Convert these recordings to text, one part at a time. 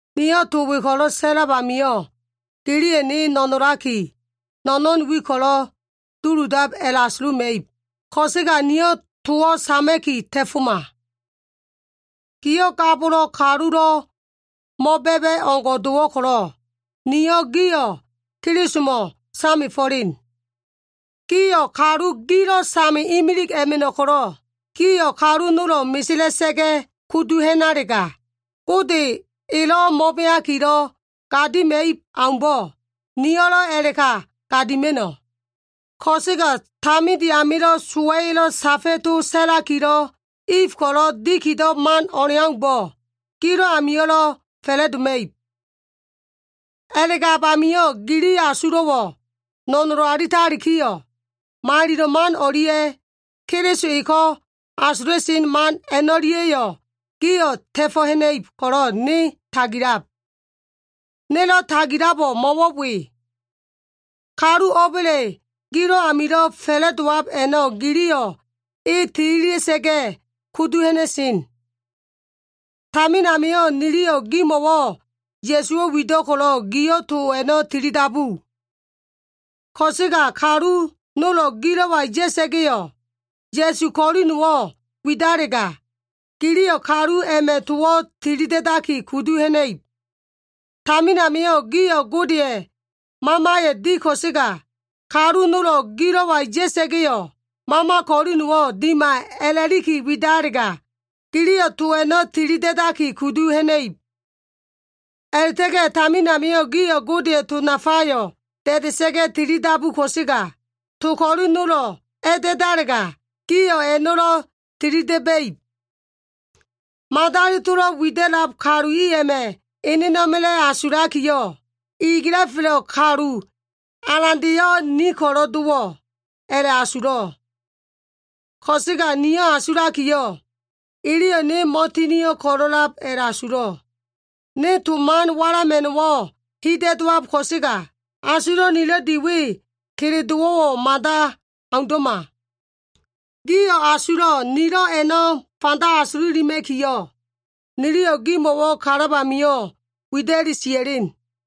Niyo꞉ to we ko꞉lo꞉ sa꞉lab amio꞉, giliyo꞉ ne no꞉nolaki, no꞉no꞉n wi ko꞉lo꞉ duludab a꞉la꞉asuluma꞉ib, ko꞉sega, niyo꞉ towo꞉ sama꞉ki ta꞉foma. Gio꞉ ga bolo꞉ kalulo꞉ mo꞉ba꞉ba꞉ o꞉ngo꞉ dowo꞉ ko꞉lo꞉, niyo꞉ gio꞉ Kelisomo꞉ samefo꞉len. Gio꞉ kalu gilo꞉ same imilig a꞉ma꞉no꞉ ko꞉lo꞉, gio꞉ kalu nolo꞉ mesela꞉sa꞉ga꞉ kudu ha꞉nalega, Gode elo꞉ mo꞉beakilo꞉ gadima꞉ib aumbo꞉, niyo꞉lo꞉ a꞉la꞉ka gadima꞉no꞉. Ko꞉sega taminde amilo꞉ sowa꞉ya꞉lo꞉ safa꞉ to sa꞉lakilo꞉ If ko꞉lo꞉ dikido꞉ man o꞉leaumbo꞉, gilo꞉ amio꞉lo꞉ fa꞉la꞉doma꞉ib. A꞉la꞉gab amio꞉ gili asulo꞉wo꞉ no꞉nolo alitalikiyo꞉, malilo꞉ man o꞉lia꞉, Keliso eko꞉ asula꞉sen man a꞉no꞉lia꞉yo꞉ gio꞉ ta꞉fo꞉ ha꞉na꞉ib ko꞉lo꞉ ne tagilab. Nelo꞉ tagilabo꞉ mo꞉wo꞉ we. Kalu o꞉ba꞉le gilo꞉ amilo꞉ fa꞉la꞉dowab a꞉no꞉ giliyo꞉ e tililia꞉sa꞉ga꞉ kudu ha꞉na꞉sen. Tamin amio꞉ niliyo꞉ gimo꞉wo꞉ Ya꞉suwo꞉ wido꞉ ko꞉lo꞉ gio꞉ to a꞉na tilidabu. Ko꞉sega kalu nolo꞉ gilo꞉wa ya꞉sa꞉ga꞉yo꞉, Ya꞉su ko꞉li nowo꞉ widalega, giliyo꞉ kalu a꞉ma꞉ towo꞉ tili da꞉daki kudu ha꞉na꞉ib. Tamin amio꞉ gio꞉ Godeya꞉ Mamayo꞉ di ko꞉sega, kalu nolo꞉ gilo꞉wa ya꞉sa꞉ga꞉yo꞉, mama ko꞉li nowo꞉ dima a꞉la꞉liki widalega, giliyo꞉ to a꞉no꞉ tili da꞉daki kudu ha꞉na꞉ib. A꞉la꞉ta꞉ga꞉ tamin amio꞉ gio꞉ Godeya꞉ to nafayo꞉ da꞉da꞉sa꞉ga꞉ tilidabu ko꞉sega, to ko꞉li nolo꞉ a꞉da꞉dalega, gio꞉ a꞉no꞉lo꞉ tilida꞉ba꞉ib. Madali tolo꞉ wida꞉lab kalu i a꞉ma꞉ enena꞉ma꞉la꞉ asulakiyo꞉, “Iliga꞉felo꞉ kalu alandeyo꞉, ni ko꞉lo꞉ dowo꞉” a꞉la꞉asulo꞉. Ko꞉sega niyo꞉ asulakiyo꞉, “Iliyo꞉ ne mo꞉tinio꞉ ko꞉lo꞉lab” a꞉la꞉asulo꞉. Ne to man walama꞉no꞉wo꞉ hida꞉ dowab ko꞉sega, asulo꞉ nilo꞉ di we kele dowo꞉wo꞉ mada aundo꞉ma. Gio꞉ asulo꞉ nilo꞉ a꞉no꞉ fanda asululima꞉kiyo꞉, niliyo꞉ gimo꞉wo꞉ kalab amio꞉ wida꞉li sia꞉len.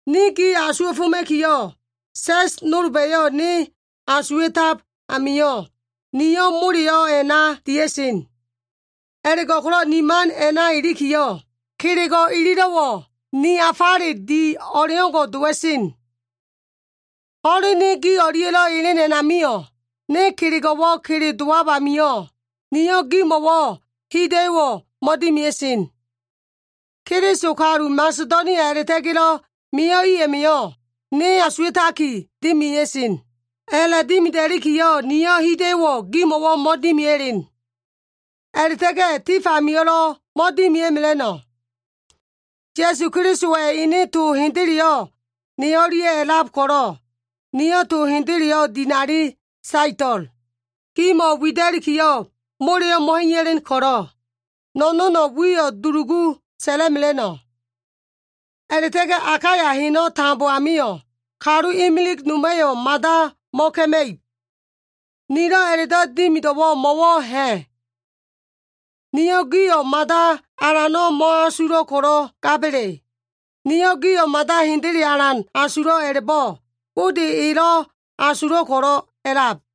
Ne gi asuwa꞉foma꞉kiyo꞉, sa꞉s nolba꞉yo꞉ ne asuwa꞉tab amio꞉, niyo꞉ moleyo꞉ a꞉na dia꞉sen. A꞉la꞉go꞉ko꞉lo꞉ ni man a꞉na ilikiyo꞉, kelego꞉ ililo꞉wo꞉ ni afale di o꞉leo꞉ngo꞉ dowa꞉sen. Ho꞉len ne gi o꞉lia꞉lo꞉ elen a꞉namio꞉, ne kelego꞉wo꞉ kele dowab amio꞉, niyo꞉ gimo꞉wo꞉ hida꞉yo꞉wo꞉ mo꞉dimia꞉sen. Keliso kalu Masedonia a꞉la꞉ta꞉ga꞉lo꞉ mio꞉ i a꞉ma꞉yo꞉, ne asuwa꞉taki dimia꞉sen. A꞉la꞉dimida꞉likiyo꞉, niyo꞉ hida꞉yo꞉wo꞉ gimo꞉wo꞉ mo꞉dimia꞉len. A꞉la꞉ta꞉ga꞉ tif amio꞉lo꞉ mo꞉dimia꞉mela꞉no꞉. Ya꞉su Kelisowa꞉ ene to hendeleyo꞉ ne o꞉lia꞉ a꞉lab ko꞉lo꞉, niyo꞉ to hendeleyo꞉ dinali saeto꞉l. Gimo꞉ wida꞉likiyo꞉ moleyo꞉ mo꞉ha꞉iya꞉len ko꞉lo꞉, no꞉no꞉ wiyo꞉ dulugu sa꞉la꞉mela꞉no꞉. A꞉la꞉ta꞉ga꞉ Akaya heno꞉ tambo amio꞉, kalu imilig noma꞉yo꞉ mada mo꞉ka꞉ma꞉ib. Nilo꞉ a꞉la꞉do꞉ dimido꞉wo꞉ mo꞉wo꞉ ha꞉? Niyo꞉ gio꞉ mada alano꞉ mo꞉asulo꞉ ko꞉lo꞉ gaba꞉le? Niyo꞉ gio꞉ mada hendele alan asulo꞉ a꞉la꞉bo꞉, Gode elo꞉ asulo꞉ ko꞉lo꞉ a꞉lab.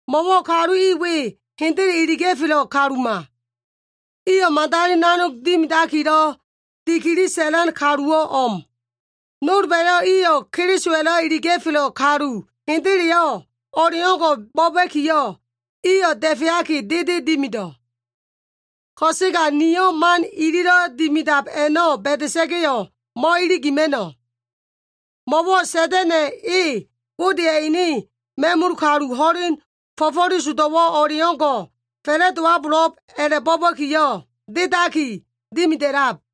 Mo꞉wo꞉ kalu i we hendele iliga꞉felo꞉ kaluma. Iyo꞉ madali nanog dimidakilo꞉ dikili sa꞉lan kaluwo꞉ o꞉m. Nolba꞉yo꞉ iyo꞉ Kelisowa꞉lo꞉ iliga꞉felo꞉ kalu hendeleyo꞉ o꞉leo꞉ngo꞉ bo꞉ba꞉kiyo꞉, iyo꞉ da꞉feaki dede dimido꞉. Ko꞉sega nio꞉ man ililo꞉ dimidab a꞉no꞉ ba꞉da꞉sa꞉ga꞉yo꞉ mo꞉iligima꞉no꞉. Mo꞉wo꞉ Sa꞉da꞉na꞉ e, Godeya꞉ ene ma꞉mul kalu ho꞉len fo꞉fo꞉lesodo꞉wo꞉ o꞉leo꞉ngo꞉ fa꞉la꞉dowabo꞉lo꞉b a꞉la꞉bo꞉ba꞉kiyo꞉, dedaki dimida꞉lab.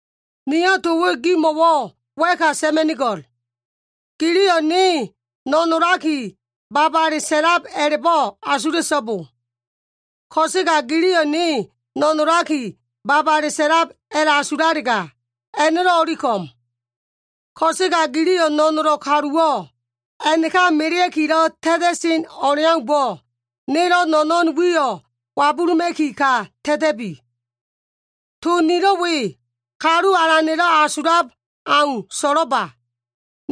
Niyo꞉ to we gimo꞉wo꞉ wa꞉ka sa꞉ma꞉nigo꞉l. Giliyo꞉ ne no꞉nolaki babale sa꞉lab a꞉la꞉bo꞉ asula꞉so꞉bo. Ko꞉sega giliyo꞉ ne no꞉nolaki babale sa꞉lab a꞉la꞉asulalega, a꞉no꞉lo꞉ o꞉li ko꞉m. Ko꞉sega giliyo꞉ no꞉nolo꞉ kaluwo꞉ a꞉naka melea꞉kilo꞉ ta꞉ta꞉sen o꞉leaumbo꞉, nelo꞉ no꞉no꞉n wiyo꞉ wabuluma꞉ki ka ta꞉ta꞉bi. To nilo꞉ we, Kalu Alana꞉lo꞉ asulab au so꞉lo꞉ba.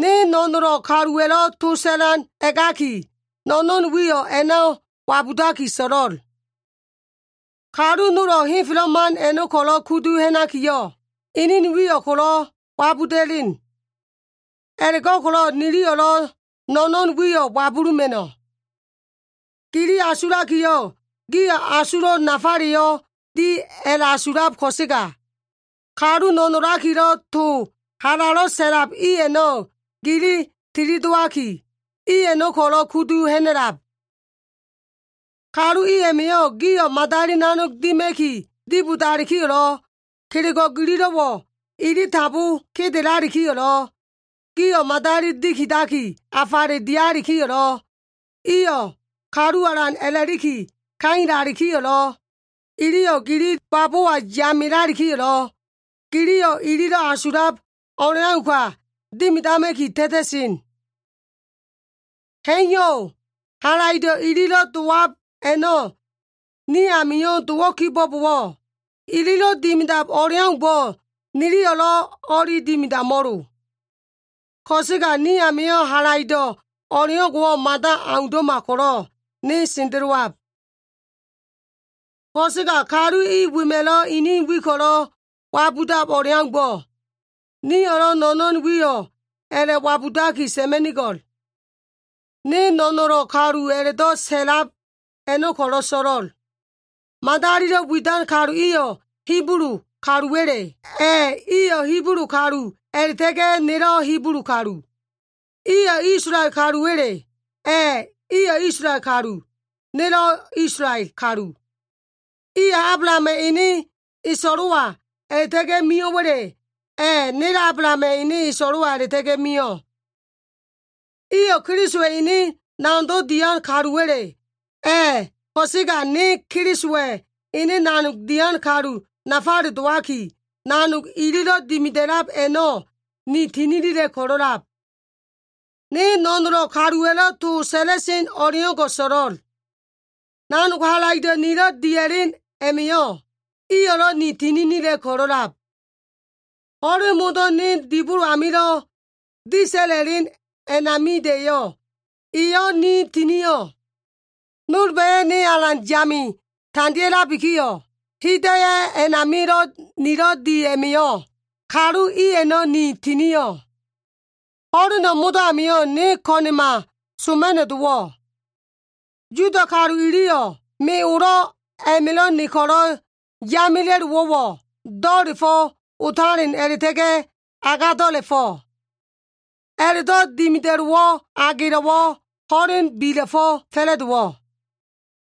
Ne no꞉nolo꞉ kaluwa꞉lo꞉ to sa꞉lan a꞉gaki, no꞉no꞉n wiyo꞉ a꞉na wabudaki so꞉lo꞉l. Kalu nolo꞉ henfelo꞉ man a꞉no꞉ ko꞉lo꞉ kudu ha꞉nakiyo꞉, inin wiyo꞉ ko꞉lo꞉ wabuda꞉len. A꞉la꞉go꞉ko꞉lo꞉ niyo꞉lo꞉ no꞉no꞉n wiyo꞉ wabuluma꞉no꞉. Gili asulakiyo꞉, gio꞉ asulo꞉ nafaleyo꞉ di a꞉la꞉asulab ko꞉sega, kalu no꞉nolakilo꞉ to halalo꞉ sa꞉lab i a꞉no꞉ gili tilidowaki, i a꞉no꞉ ko꞉lo꞉ kudu ha꞉na꞉lab. Kalu i a꞉ma꞉yo꞉ gio꞉ madali nanog dima꞉ki dibodalikiyo꞉lo꞉, kelego꞉ gililo꞉wo꞉ ili tambo kedelalikiyo꞉lo꞉, gio꞉ madali dikidaki afale dialikiyo꞉lo꞉, iyo꞉ kalu alan a꞉laki kailalikiyo꞉lo꞉, iliyo꞉ gili babowa yamelalikiyo꞉, giliyo꞉ ililo꞉ asulab o꞉leau ka dimidama꞉ki ta꞉ta꞉sen. Ha꞉iyo꞉. Halaido꞉ ililo꞉ dowab a꞉no꞉ ni amio꞉ dowo꞉ kibo꞉bowo꞉, ililo꞉ dimidab o꞉leaumbo꞉, niliyo꞉lo꞉ o꞉li dimidamo꞉lo. Ko꞉sega ni amio꞉ halaido꞉ o꞉leo꞉ngo꞉wo꞉ mada aundo꞉ma ko꞉lo꞉ ne sendelowab. Ko꞉sega kalu i wema꞉lo꞉ inin wi ko꞉lo꞉ wabudab o꞉leaumbo꞉, niyo꞉lo꞉ no꞉no꞉n wiyo꞉ a꞉la꞉wabudaki sa꞉ma꞉nigo꞉l. Ne no꞉nolo꞉ kalu a꞉la꞉do꞉ sa꞉lab a꞉no꞉ ko꞉lo꞉ so꞉lo꞉l. Madalilo꞉ widan kalu iyo꞉ Hibulu kaluwa꞉le? A꞉, iyo꞉ Hibulu kalu a꞉la꞉ta꞉ga꞉ nelo꞉ Hibulu kalu. Iyo꞉ Isolael kaluwa꞉le? A꞉, iyo꞉ Isolael kalu. Nelo꞉ Isolael kalu. Iyo꞉ Ablahama꞉ ene eso꞉lo꞉wa a꞉la꞉ta꞉ga꞉ mio꞉wa꞉le? A꞉, nelo꞉ Ablahama꞉ ene eso꞉lo꞉wa a꞉la꞉ta꞉ga꞉ mio꞉. Iyo꞉ Kelisowa꞉ ene nanogdo꞉ dian kaluwa꞉le? A꞉, ko꞉sega ne Kelisowa꞉ ene nanog dian kalu nafale dowaki, nanog ililo꞉ dimida꞉lab a꞉no꞉ ni tininila꞉ ko꞉lo꞉lab. Ne no꞉nolo꞉ kaluwa꞉lo꞉ to sa꞉la꞉sen o꞉leo꞉ngo꞉ so꞉lo꞉l. Nanog halaido꞉ nilo꞉ dia꞉len a꞉ma꞉yo꞉, iyo꞉lo꞉ ni tininila꞉ ko꞉lo꞉lab. Ho꞉len modo꞉ ko꞉lo꞉ ne dibolo amilo꞉ disa꞉la꞉len a꞉namida꞉yo꞉, iyo꞉ ni tinio꞉. Nolba꞉yo꞉ ne alan yame tandea꞉labikiyo꞉, hida꞉yo꞉ a꞉namilo꞉ nilo꞉ di a꞉ma꞉yo꞉, kalu i a꞉no꞉ ni tinio꞉. Ho꞉leno꞉ modo꞉ amio꞉ ne ko꞉na꞉ma soma꞉no꞉ dowo꞉. Yuda kalu iliyo꞉ me olo꞉ a꞉ma꞉lo꞉ ne ko꞉lo꞉ yamela꞉lowo꞉wo꞉, do꞉la꞉fo꞉ otalen a꞉la꞉ta꞉ga꞉ agado꞉la꞉fo꞉. A꞉la꞉do꞉ dimida꞉lowo꞉ agelo꞉wo꞉ ho꞉len bila꞉fo꞉ fa꞉la꞉dowo꞉.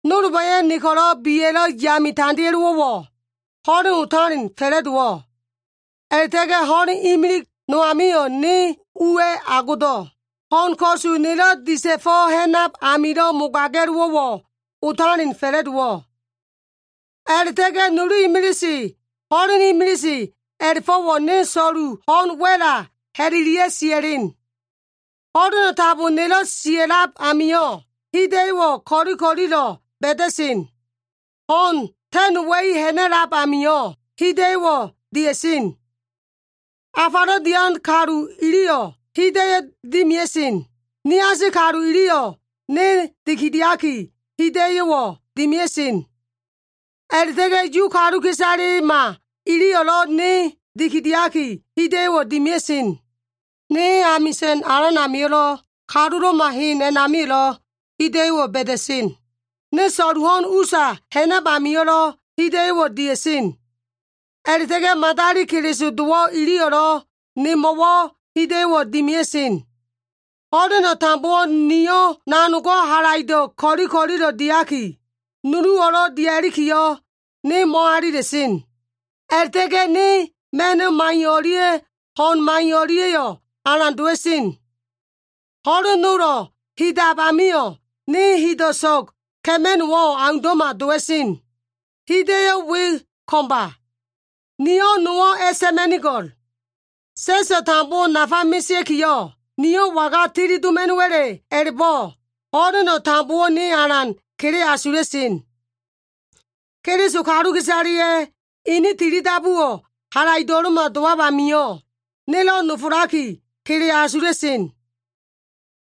Nolba꞉yo꞉ ne ko꞉lo꞉ biya꞉lo꞉ yame tandea꞉lowo꞉wo꞉, ho꞉len otalen fa꞉la꞉dowo꞉. A꞉la꞉ta꞉ga꞉ ho꞉len imilig no amio꞉ ne uwa꞉ agodo꞉. Ho꞉n ko꞉su nelo꞉ disa꞉fo꞉ ha꞉nab amilo꞉ mogaga꞉lowo꞉wo꞉ otalen fa꞉la꞉dowo꞉. A꞉la꞉ta꞉ga꞉ nulu imilise, ho꞉len imilise a꞉la꞉fo꞉wo꞉ ne so꞉lu ho꞉n wa꞉la ha꞉lelia꞉ sia꞉len. Ho꞉leno꞉ tambo nelo꞉ sia꞉lab amio꞉, hida꞉yo꞉wo꞉ ko꞉li ko꞉lilo꞉ ba꞉da꞉sen. Ho꞉n ta꞉nowa꞉i ha꞉na꞉lab amio꞉, hida꞉yo꞉wo꞉ dia꞉sen. Afalo꞉ dian kalu iliyo꞉, hida꞉yo꞉wo꞉ dimia꞉sen. Niasi kalu iliyo꞉ ne dikidiaki hida꞉yo꞉wo꞉ dimia꞉sen. A꞉la꞉ta꞉ga꞉ Yu kaluka꞉isalema iliyo꞉lo꞉ ne dikidiaki hida꞉yo꞉wo꞉ dimia꞉sen. Ne amisa꞉n alan amio꞉lo꞉, kalulo꞉ma hen a꞉namio꞉lo꞉ hida꞉yo꞉wo꞉ ba꞉da꞉sen. Ne so꞉lu ho꞉n usa ha꞉nab amio꞉lo꞉, hida꞉yo꞉wo꞉ dia꞉sen. A꞉la꞉ta꞉ga꞉ madali Keliso dowo꞉ iliyo꞉lo꞉ nemo꞉wo꞉ hida꞉yo꞉wo꞉ dimia꞉sen. Ho꞉leno꞉ tambowo꞉ niyo꞉ nanogo꞉ halaido꞉ ko꞉li ko꞉lilo꞉ diaki, nuluwo꞉lo꞉ dia꞉likiyo꞉, ne mo꞉alila꞉sen. A꞉la꞉ta꞉ga꞉ ne ma꞉no꞉ maiyo꞉ o꞉lia꞉ ho꞉n maiyo꞉ o꞉lia꞉yo꞉ alan dowa꞉sen. Ho꞉len nolo꞉ hidab amio꞉ ne hido꞉ so꞉g ka꞉ma꞉no꞉wo꞉ aundo꞉ma dowa꞉sen. Hida꞉yo꞉ we ko꞉mba. Niyo꞉ to nowo꞉ a꞉sa꞉ma꞉nigo꞉l. Sa꞉so꞉ tambowo꞉ nafa mesea꞉kiyo꞉, niyo꞉ waga tili doma꞉no꞉wa꞉le a꞉la꞉bo꞉, ho꞉leno꞉ tambowo꞉ ne alan kele asula꞉sen. Keliso kaluka꞉isaleya꞉ ini tilidabuwo꞉ halaido꞉lo꞉ma dowab amio꞉, nelo꞉ nofolaki, kele asula꞉sen.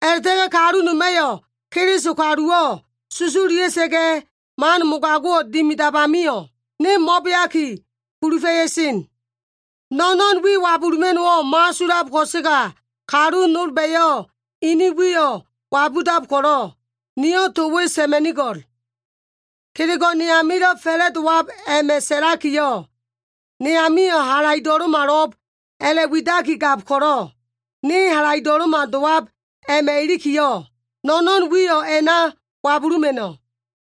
A꞉la꞉ta꞉ga꞉ kalu noma꞉yo꞉ Keliso kaluwo꞉ susululia꞉sa꞉ga꞉, man mogago꞉wo꞉ dimidab amio꞉, ne mo꞉beaki kulufa꞉ya꞉sen. No꞉no꞉n wi wabuluma꞉no꞉wo꞉ mo꞉asulab ko꞉sega, kalu nolba꞉yo꞉ ini wiyo꞉ wabudab ko꞉lo꞉, niyo꞉ to we sa꞉ma꞉nigo꞉l. Kelego꞉ ne amilo꞉ fa꞉la꞉dowab a꞉ma꞉ sa꞉lakiyo꞉, ne amio꞉ halaido꞉lo꞉malo꞉b a꞉la꞉widaki gab ko꞉lo꞉, ne halaido꞉lo꞉ma dowab a꞉ma꞉ ilikiyo꞉, no꞉no꞉n wiyo꞉ a꞉na wabuluma꞉no꞉.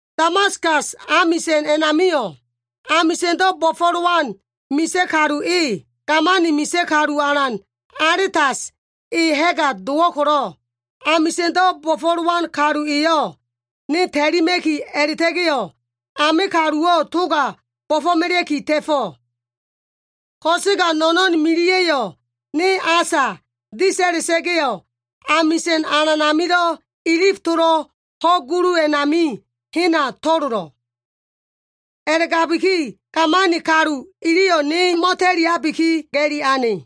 Damaskas amisa꞉n a꞉namio꞉, amisa꞉ndo꞉ bo꞉fo꞉lowan misa꞉ kalu e, gamani misa꞉ kalu alan Aletas e ha꞉ga dowo꞉ ko꞉lo꞉, amisa꞉ndo꞉ bo꞉fo꞉lowan kalu eyo꞉ ne ta꞉lima꞉ki a꞉la꞉ta꞉ga꞉yo꞉, ame kaluwo꞉ toga bo꞉fo꞉melea꞉ki ta꞉fo꞉. Ko꞉sega no꞉no꞉n miliya꞉yo꞉ ne asa disa꞉la꞉sa꞉ga꞉yo꞉, amisa꞉n alan amilo꞉ ilif tolo꞉ ho꞉ gulu a꞉nami hena to꞉lolo꞉. A꞉la꞉gabiki, gamani kalu iliyo꞉ ne mo꞉ta꞉liabiki, ga꞉li ane.